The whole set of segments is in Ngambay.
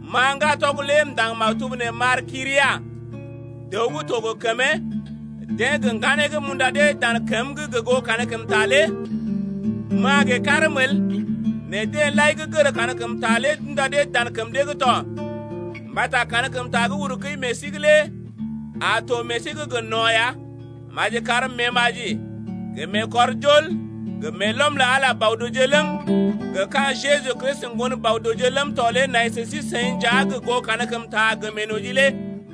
Ma ŋgatɔg lé m’ndaŋg maktub nee m’ar Kyria, dəw gə́ to gə kəmee, deḛ gə ŋganee gə́ m’unda dee dan kəm’g gə goo kankəmta lé, ma gə karm el, nɛ deḛ lai gə́ gər kankəmta lé d’unda dee dan kəm dee’g to mbata kankəmta gə́ uru kəi meḛ sí’g lé a to meḛ sí’g gə no̰ ya. Maji kar meemaji, gə meekɔrjol, gə meelɔm lə Ala Bɔ-dəwje ləm, gə ka̰ Jeju Kristi Ŋgon Bɔ-dəwje ləm tɔ lé nai sə sí-seḭ nja gə goo kankəmta gə meenoji lé.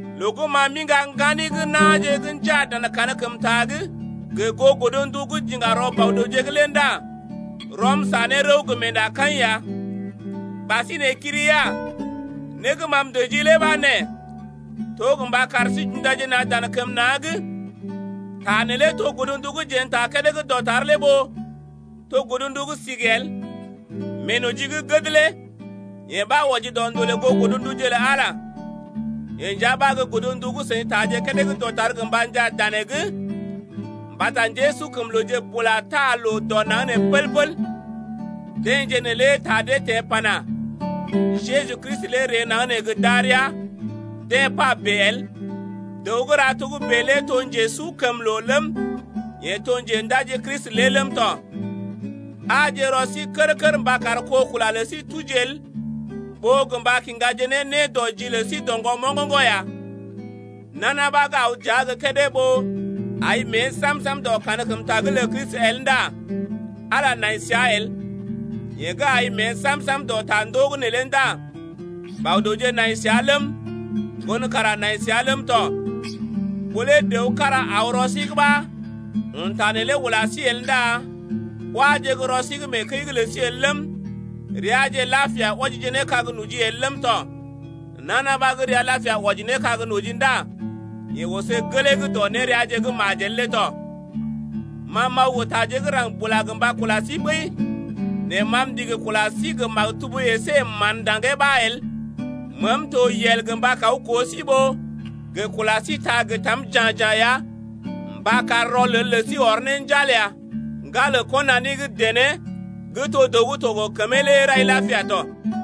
Loo gə́ ma m’iŋga ŋgani gə́ na̰je gə́ njaa dan kankəmta’g, gə goo godndu gə́ j’iŋga rɔ Bɔ-dəwje’g lé ndá rɔm sa ne rəw gə meendakaḭ ya. Ɓasinè Kyria, né gə́ ma m’dəjii lé ɓa nee: To mba kar sí j’undaje na̰ dan kəm na̰’d. Ta neelé to godndu gə́ jeḛ n’taa kédé gə́ dɔtar lé ɓó to godndu gə́ sigi el. Meenoji gə́ gəd lé yee ɓa wɔji dɔ ndolè goo godnduje lə Ala lé. Yee nja ɓa gə́ godndu gə́ seḭ taaje kédé gə́ dɔtar gə mba njaa danee’g ya. Mbata njésukəmlooje bula taa loo dɔ naŋg nee pəl-pəl. Deḛje neelé ta dee teḛ pana: Jeju Kristi lé ree naŋg nee gə darəa, deḛ pa bèe el. Dəw gə́ ra togə́bè lé to njesukəmloo ləm, yeḛ to Njendaji Kristi lé ləm tɔ. Aaje rɔ sí kər-kər mba kar kó kula lə sí tuji el ɓó gə mba kiŋgaje ne nédɔji lə sí doŋgɔ moŋgoŋgo̰ ya. Nana ɓa gə́ aw dəa gə́ kédé ɓó ai mée sam-sam dɔ kankəmta’g lə Kristi el ndá Ala nai səa el. Yeḛ gə́ ai mée sam-sam dɔ tandoo’g neelé ndá Bɔ-dəwje nai səa ləm, Ŋgon kara nai səa ləm tɔ. Ɓó lé dəw kára aw rɔ sí’g ɓa, un ta neelé ula sí el ndá wáje gə́ rɔ sí’g mee kəi’g lə sí el ləm, reaje lapia wɔjije ne kag noji el ləm tɔ. Nana ɓa gə́ rəa lapia wɔji ne kag noji ndá yeḛ oso gelee’g dɔ néreaje’g gə́ majel lé tɔ. Ma m’aw gə taje gə́ raŋg bula gə mba kula sí ɓəi nɛ ma m’ndigi kula sí gə maktub əsé gə mán ndaŋgee ɓa el. Meem to yel gə mba kaw koo sí ɓó gə kula sí ta gə tam ja̰-ja̰ ya mba kar rɔlel lə sí ɔr ne njal ya. Ŋgalə kɔnani gə́ dené gə́ to dəw gə́ to gə kəmee lé rai lapia tɔ.